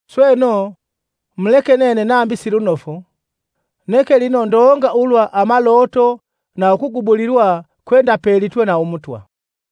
Sweno, muleke nene nambi silunofu! Neke lino ndonga ulwa amaloto na ukugubulilwa kwendapelitwe na Umutwa.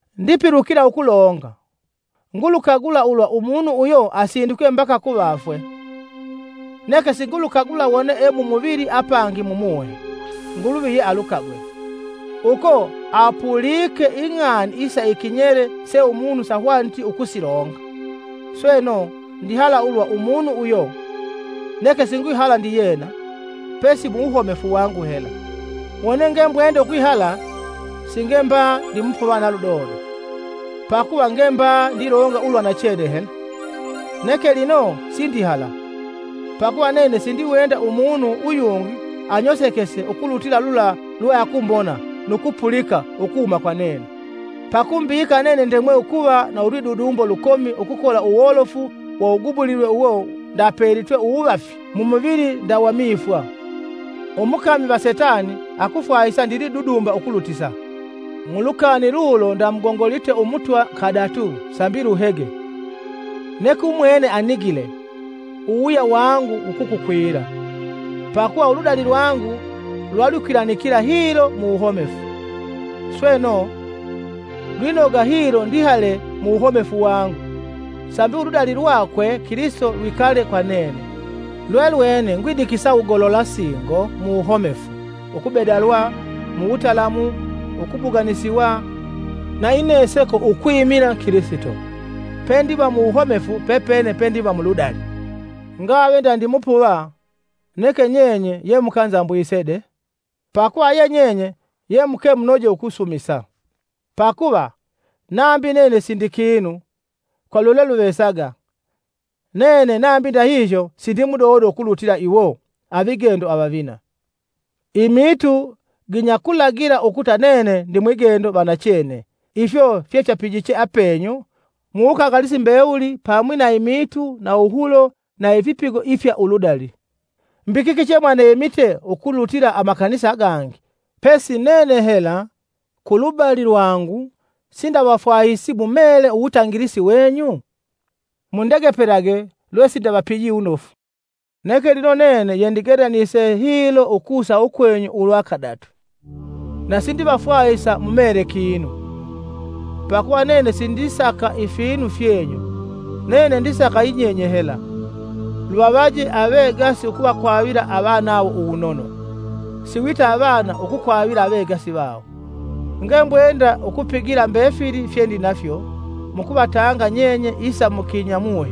Ndipilukila ukulonga! Ngulukagula ulwa umunu uyo asindikwe mbaka kuvafwe. (Neke singulukagula wone e mumuvili apangi mumuhe; Nguluvi ye alukagwe) Uko apulike ing'ani isa ikinyele se umunu sahwaniti ukusilonga. Sweno, ndihala ulwa umunu uyo, neke singwihala ndiyena, pesi mu wuhomefu wangu hela. Wone ngembwende ukwihala, singe mba ndi mupuva na ludodo, pakuva nge mba ndilonga ulwa nachene hela. Neke lino sindihala; pakuva nene sindiwenda umunu uyungi anyosekese ukulutila lula lwe akumbona nu kupulika ukuhuma kwa nene. Pakumbika nene ndemwe ukuva na ulwidudumbo lukomi ukukola uwolofu wa uwugubulilwe uwo ndapelitwe uwuvafi mumuvili nda wa mifwa, umukomi va Setani akufwahisa ndilidudumba ukulutisa. Mu lukani lulo ndamugongolite Umutwa kadatu, sambi luhege. Neke umwene anigile, “Uwuwuya wangu wukukukwila; pakuva uludali lwangu lwalwikwilanikila hilo mu wuhomefu.” Sweno, lwinoga hilo ndihale mu wuhomefu wangu sambi uludali lwakwe Kilisito lwikale kwa nene. Lwelwene ngwidikisa wugolola singo uwuhomefu ukubedalwa, mutalamu, ukubuganisiwa, na ineseko ukwimila Kilisito, pendiva mu wuhomefu pepene pendiva mu ludali. Ngave nda ndi mupuva, neke nyenye yemukanzambwise de. Pakuva ye nyenye ye muke munoje ukusumusa. Pakuva, nambi nene sindi kinu, kwa lwelweluvesaga, nene nambi ndahihyo sindimudodo ukulutila iwo, “Avigendo avavina.” Imiitu ginyakulagila ukuta nene ndi mwigendo va nachene ifyo fyapigiche apenyu muwukangalisi mbewuli pamwi na imiitu na uwuhulo na ifipigo ifya uludali. Mbi kiki chemwaneemite ukulutila amakanisa agangi, pesi nene hela ku lubali lwangu sindavafwahisi mu meele uwutangi wenyu? Mundegepelage lwesindavapiji wunofu. Neke lino nene yendigelanise hilo ukusa ukwenyu ulwa kadatu, na sindivafwahisa mumeele kinu. Pakuva nene sindisaka ifinu fyenyu, nene ndisaka yinyenye hela. Luvavaje avegasi ukuvakwavila avanawo uwunono, avana ukukwavila avegasi vawo. Ngembwenda ukupigila mbefili fyendinafyo mukuvatanga nyenye isa mukinyamuhe.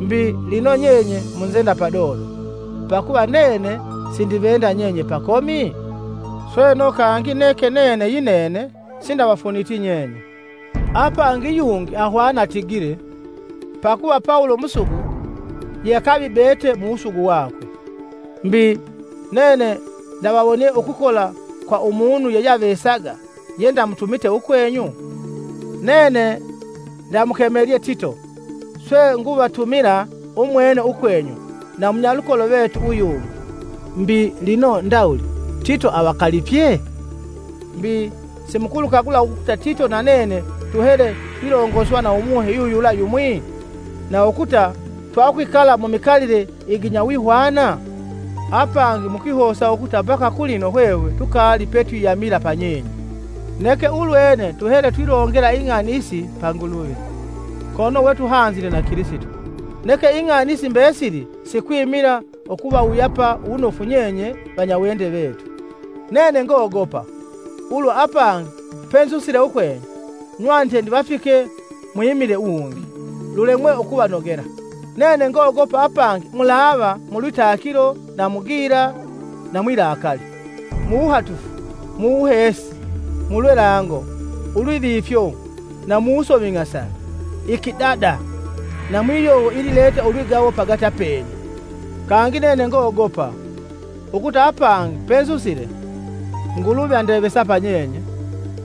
Mbi, lino nyenye munzenda padodo, pakuva nene sindivenda nyenye pakomi? Sweno kangi neke nene yinene sindavafuniti nyenye. Apangi yungi ahwana atigile, “Pakuva Pawulo musugu yeakavibete mu wusugu wakwe.” Mbi, nene ndavawonie ukukola kwa umunu yeyeavesaga yendamutumite ukwenyu? Nene ndamukemelye Tito, swe nguvatumila umwene ukwenyu na munyalukolo vetu uyungi. Mbi, lino ndawuli Tito avakalipye? Mbi, simukulukagula ukuta Tito na nene tuhele twilongoswa na Umuhe yuyula yumwi? Na ukuta twakwikala mumikalile iginyawihwana? Apangi mukwihosa ukuta mbaka kulino hwehwe tukaali petwiyaamila kanisa pa nyenye! Neke ulwene tuhele twilongela ing'ani isi pa Nguluvi, kono we tuhanzile na Kilisito. Neke ing'ani isi mbesili sikwimila ukuvawuyapa wunofu nyenye vanyawende vetu. Nene ngogopa, ulwa apangi penzusile ukwenyu, nywanite ndivafike mwimile wungi, lulemwe ukuvanogela. Nene ngogopa apangi mulava mu lwitakilo na mu gila na mwilakali, muwuhatufu, mu wuheesi, mu lwelango, ulwivifyo, na muwusoming'asa, ikidada na mwiyovo ilileta ulwigawo pagati apenyu. Kangi nene ngogopa, ukuta apangi penzusile, Nguluvi andevesa pa nyenye,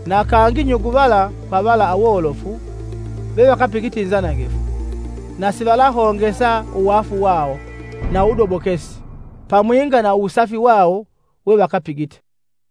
na kangi nyuguvala kwa vala awolofu vevakapigite inzanangifu, na sivalahongesa uwaafu wawo, na uwudobokesi, pamwinga na uwusafi wawo wevakapigite.